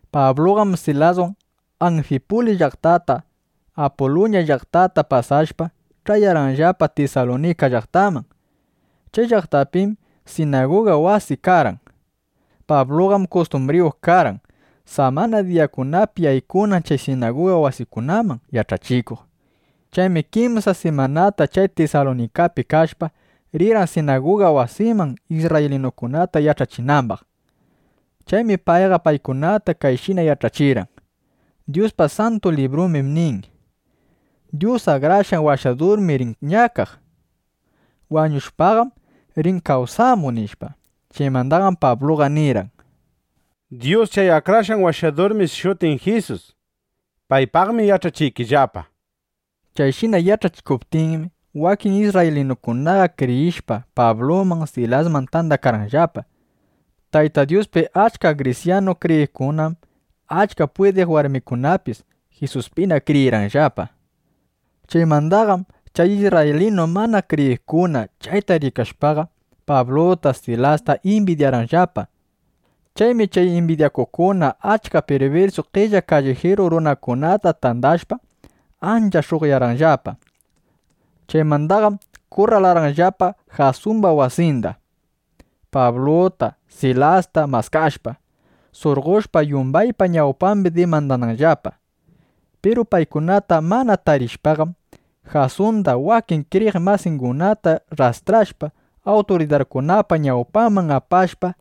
Pabluqam Silaswan Anfipulis llaqtata, Apuluña llaqtata pasashpa, ch'ayarqanllapa Tisalunika llaqtaman. Chay llaqtapim sinaguga wasi karqan. Pabluqam kustumbriyuq karqan, samana diyakunapi yaykunan chay sinaguga wasikunaman yach'achikuq. Chaymi kimsa simanata chay Tisalunikapi kashpa, rirqan sinaguga wasiman, isrraylinukunata yach'achinambaq. Chaymi payqa paykunata kayshina yach'achirqan: —Dyuspa Santu Librumbim nin: “Dyus Akrashqan Washadurmi rin ñakaq. Wañushpaqam rin kawsamuq”, nishpa. Chaymandaqam Pabluqa nirqan: —Dyus chay Akrashqan Washadurmi shutin Jisus. Paypaqmi yach'achiykillapa, nishpa. Chayshina yach'achikuptinmi, wakin isrraylinukunaqa kriyishpa, Pabluman, Silasman tandakarqanllapa. Tayta Dyuspi achka grisyanu kriyiqkunam achka pwidiq warmikunapis Jisuspina kriyirqanllapa. Chaymandaqam chay isrraylinu mana kriyiqkuna chayta rikashpaqa, Pabluta Silasta imbidyarqanllapa. Chaymi chay imbidyakuqkuna achka pirbirsu qella kallijiru runakunata tandashpa, ancha sh'uqyarqanllapa. Chaymandaqam kurralarqanllapa Jasumba wasinda, Pabluta, Silasta maskashpa, surqoshpa yumbaypa ñawpambi dimandananllapa. Piru paykunata mana tarishpaqam, Jasunda, wakin kriyiq masingunata rrastrashpa, awturidarkunapa ñawpanman apashpa,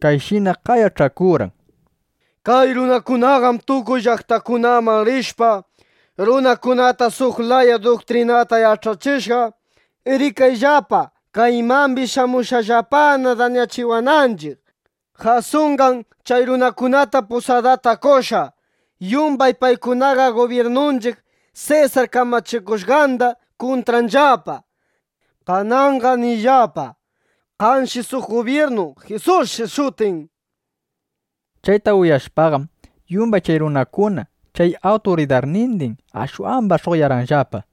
kayshina qayach'akurqan: —Kay runakunaqam tukuy llaqtakunaman rishpa, runakunata suq laya duktrinata yach'achishqa. Rikayllapa, kaymambis shamushqallapana, dañachiwananchiq. Jasunqam chay runakunata pusadata qoshqa. Yumbay paykunam gubyirnunchiq Sesar kamachikushqanda kuntranllapa. Kananqam ninllapa: “Kanshi suq gubyirnu. Jisusshi shutin”, nishpa. Chayta uyashpaqam, yumbay chay runakuna, chay awturidarnindin ashwamba sh'uqyarqanllapa.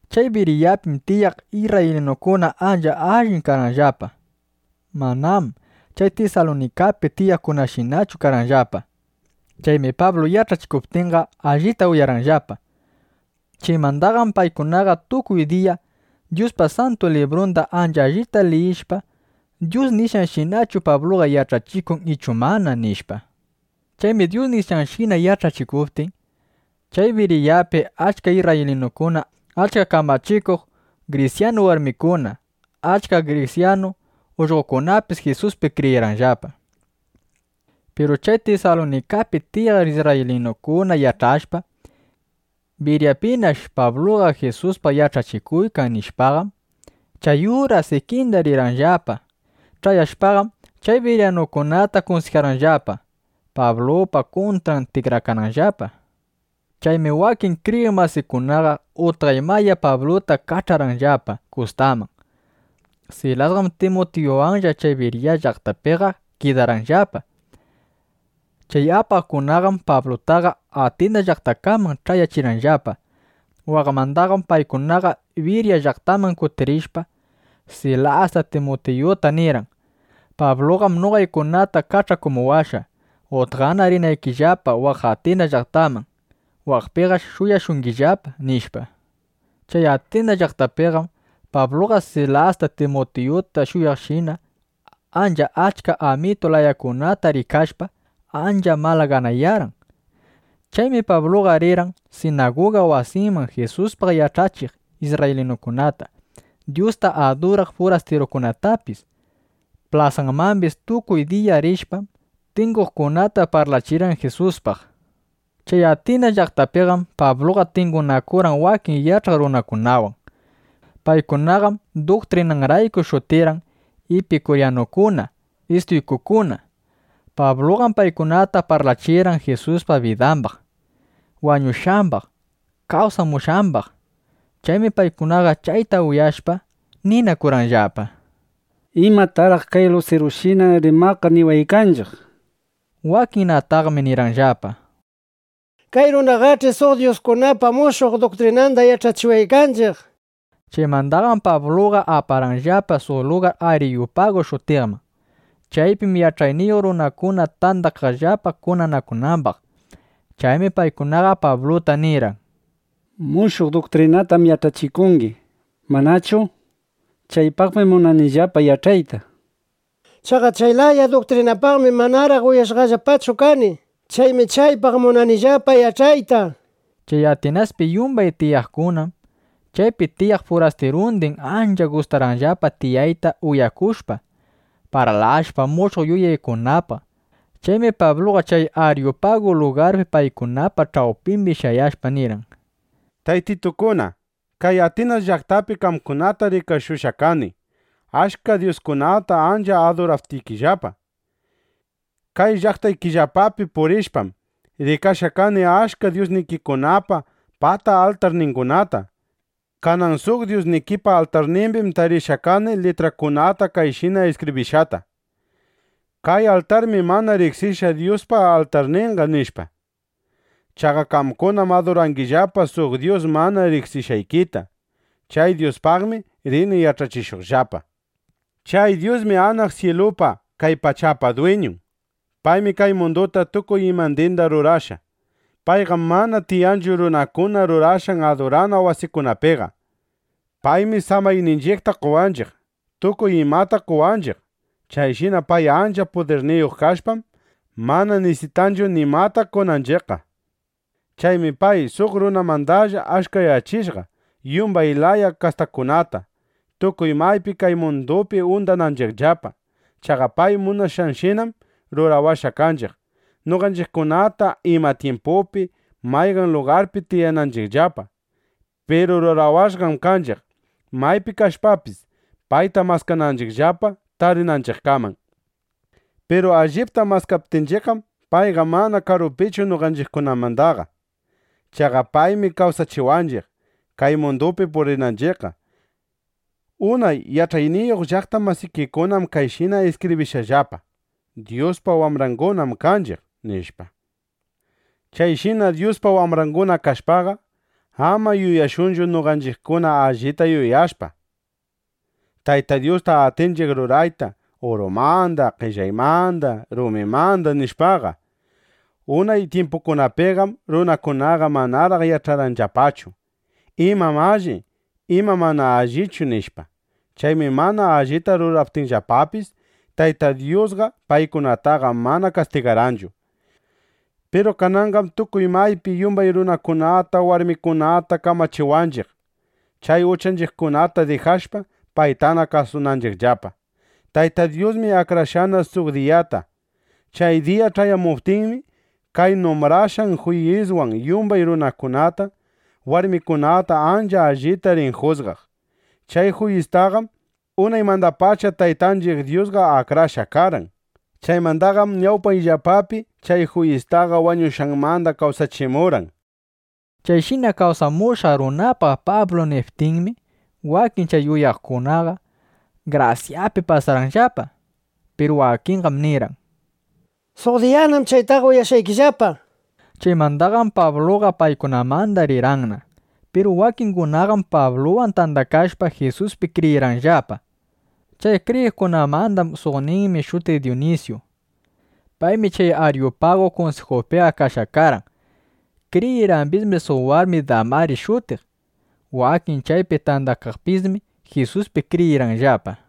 Chay Biriyapim tiyaq isrraylinukuna ancha allin karqanllapa. Manam chay Tisalunikapi tiyaqkunashinachu karqanllapa. Chaymi Pablu yach'achikuptinqa, allita uyarqanllapa. Chaymandaqam paykunaqa tukuy diya Dyuspa Santu Librunda ancha allita liyiqllapa yach'ananllapa: ¿Dyus nishqanshinachu Pabluqa yach'achikun ichu mana? nishpa. Chaymi Dyus nishqanshina yach'achikuptin, chay Biriyapi achka isrraylinukuna, achka kamachikuq grisyanu warmikuna, achka grisyanu ullqokunapis Jisuspi kriyirqanllapa. Piru chay Tisalunikapi tiyaq isrraylinukuna yach'ashpa: Biriyapinash Pabluqa Jisuspaq yach'achikuykan, nishpaqam, chay uras ikinda rirqanllapa. Ch'ayashpaqam chay biriyanukunata kunsijarqanllapa, Pablupa kuntran tikrakananllapa. Chaymi wakin kriyiq masikunaqa utqay maya Pabluta kach'arqanllapa kustaman. Silasqam Timutiyuwanlla chay Biriya llaqtapiqa kidarqanllapa. Chay apaqkunaqam Pablutaqa Atinas llaqtakaman ch'ayachirqanllapa. Waqmandaqam paykunaqa Biriya llaqtaman kutirishpa, Silasta Timutiyuta nirqan: —Pabluqam noqaykunata kach'akumuwashqa, utqana rinaykillapa waq Atinas llaqtaman. Waqpinash shuyashungillapa, nishpa. Chay Atinas llaqtapiqam Pabluqa Silasta, Timutiyuta shuyaqshina, ancha achka amitu layakunata rikashpa, ancha malaganayarqan. Chaymi Pabluqa rirqan sinaguga wasiman Jisuspaq yach'achiq isrraylinukunata, Dyusta aduraq furastirukunatapis. Plasamambis tukuy diya rishpam, tinguqkunata parlachirqan Jisuspaq. Chay Atinas llaqtapiqam Pabluqa tingunakurqan wakin yach'aq runakunawan. Paykunaqam duktrinangunarayku shutirqan Ipikuryanukuna, Istuykukuna. Pabluqam paykunata parlachirqan Jisuspa bidambaq, wañushqambaq, kawsamushqambaq. Chaymi paykunaqa chayta uyashpa, ninakurqanllapa: —¿Imataraq kay lurushina rimaqqa niwanchiq? nishpa. Wakinnataqmi nirqanllapa: —Kay runaqach'i suq dyuskunapa mushuq duktrinanda yach'achiwaykanchiq, nishpa. Chaymandaqam Pablutaqa aparqanllapa suq lugar Ariyupagu shutiqman. Chaypim yach'ayniyuq runakuna tandakaqllapa kunanakunambaq. Chaymi paykunaqa Pabluta nirqan: —Mushuq duktrinatam yach'achikungi, ¿manachu? Chaypaqmi munanillapa yach'ayta. Chaqa chay laya duktrinapaqmi manaraq uyashqallapachu kani. Chaymi chaypaq munanillapa yach'ayta, nishpa. Chay Atinaspi yumbay tiyaqkunam, chaypi tiyaq furastirundin ancha gustaqllapa tiyayta uyakushpa, parlashpa mushuq yuyaykunapaq. Chaymi Pabluqa chay Aryupagu lugarpi paykunapa ch'awpimbi shayashpa, nirqan: —Taytitukuna, kay Atinas llaqtapi qamkunata rikashushqa kani, achka dyuskunata ancha aduraptikillapa. Kay llaqtaykillapapi purishpam, rikashqa kani achka dyusnikikunapa pata altarningunata. Kanan suq dyusnikipa altarnimbim tarishqa kani litrakunata kayshina iskibrishqata: “Kay altarmi mana riqsishqa Dyuspa altarninqa”, nishpa. Chaqa qamkunam adurangillapa suq Dyus mana riqsishqaykita. Chay Dyuspaqmi rini yach'achishuqllapa. ’Chay Dyusmi anaq syilupa, kay pachapa dwiñun. Paymi kay munduta tukuy imandinda rurashqa. Payqam mana tiyanchu runakuna rurashqan adurana wasikunapiqa. Paymi samayninchiqta qowanchiq. Tukuy imata qowanchiq. Chayshina pay ancha pudirniyuq kashpam, mana nisitanchu nimata qonanchiqqa. ’Chaymi pay suq runamandalla achkayachishqa yumbay laya kastakunata, tukuy maypi kay mundupi undananchiqllapa. Chaqa pay munashqanshinam rurawashqa kanchiq, noqanchiqkuna ima tyimpupi, mayqan lugarpi tiyananchiqllapa. Piru rurawashqam kanchiq, maypi kashpapis, payta maskananchiqllapa tarinanchiqkaman. Piru allipta maskaptinchiqqam, payqa mana karupichu noqanchiqmandaqa. Chaqa paymi kawsachiwanchiq, kay mundupi purinanchiqqa. Unay yach'ayniyuq llaqta masikikunam kayshina iskibrishqallapa: “Dyuspa wambrangunam kanchiq”, nishpa. Chayshina Dyuspa wambranguna kashpaqa, ama yuyashunchu: Noqanchiqkuna allita yuyashpa, Tayta Dyusta atinchiq rurayta urumanda, qellaymanda, rumimanda, nishpaqa. Unay tyimpukunapiqam runakunaqa manaraq yach'arqanllapachu: ¿Imam alli? ¿Imam mana allichu? nishpa. Chaymi mana allita ruraptinllapapis, Tayta Dyusqa paykunataqa mana kastigarqanchu. Piru kananqam tukuy maypi yumbay runakunata, warmikunata kamachiwanchiq, chay uchanchiqkunata dijashpa, paytana kasunanchiqllapa. Tayta Dyusmi akrashqana suq diyata. Chay diya ch'ayamuptinmi, pay numbrashqan juyiswan yumbay runakunata, warmikunata ancha allita rin jusgaq. Chay juyistaqam unaymandapacha Taytanchiq Dyusqa akrashqa karqan. Chaymandaqam ñawpayllapapi chay juyistaqa wañushqanmanda kawsachimurqan, nishpa. Chayshina kawsamushqa runapaq Pablu niptinmi, wakin chay uyaqkunaqa grasyapi pasarqanllapa. Piru wakinqam nirqan: —Suq diyanam chaytaqa uyashqaykillapa, nishpa. Chaymandaqam Pabluqa paykunamandaqa rirqanna. Piru wakingunaqam Pabluwan tandakashpa, Jisuspi kriyirqanllapa. Chay kriyiqkunamanda suqninmi shutiq Dunisyu. Paymi chay Ariyupagu kunsijupiqa kashqa karqan. Kriyirqambismi suq warmi Damaris shutiq. Wakin chaypi kaqkunapismi Jisuspi kriyirqanllapa.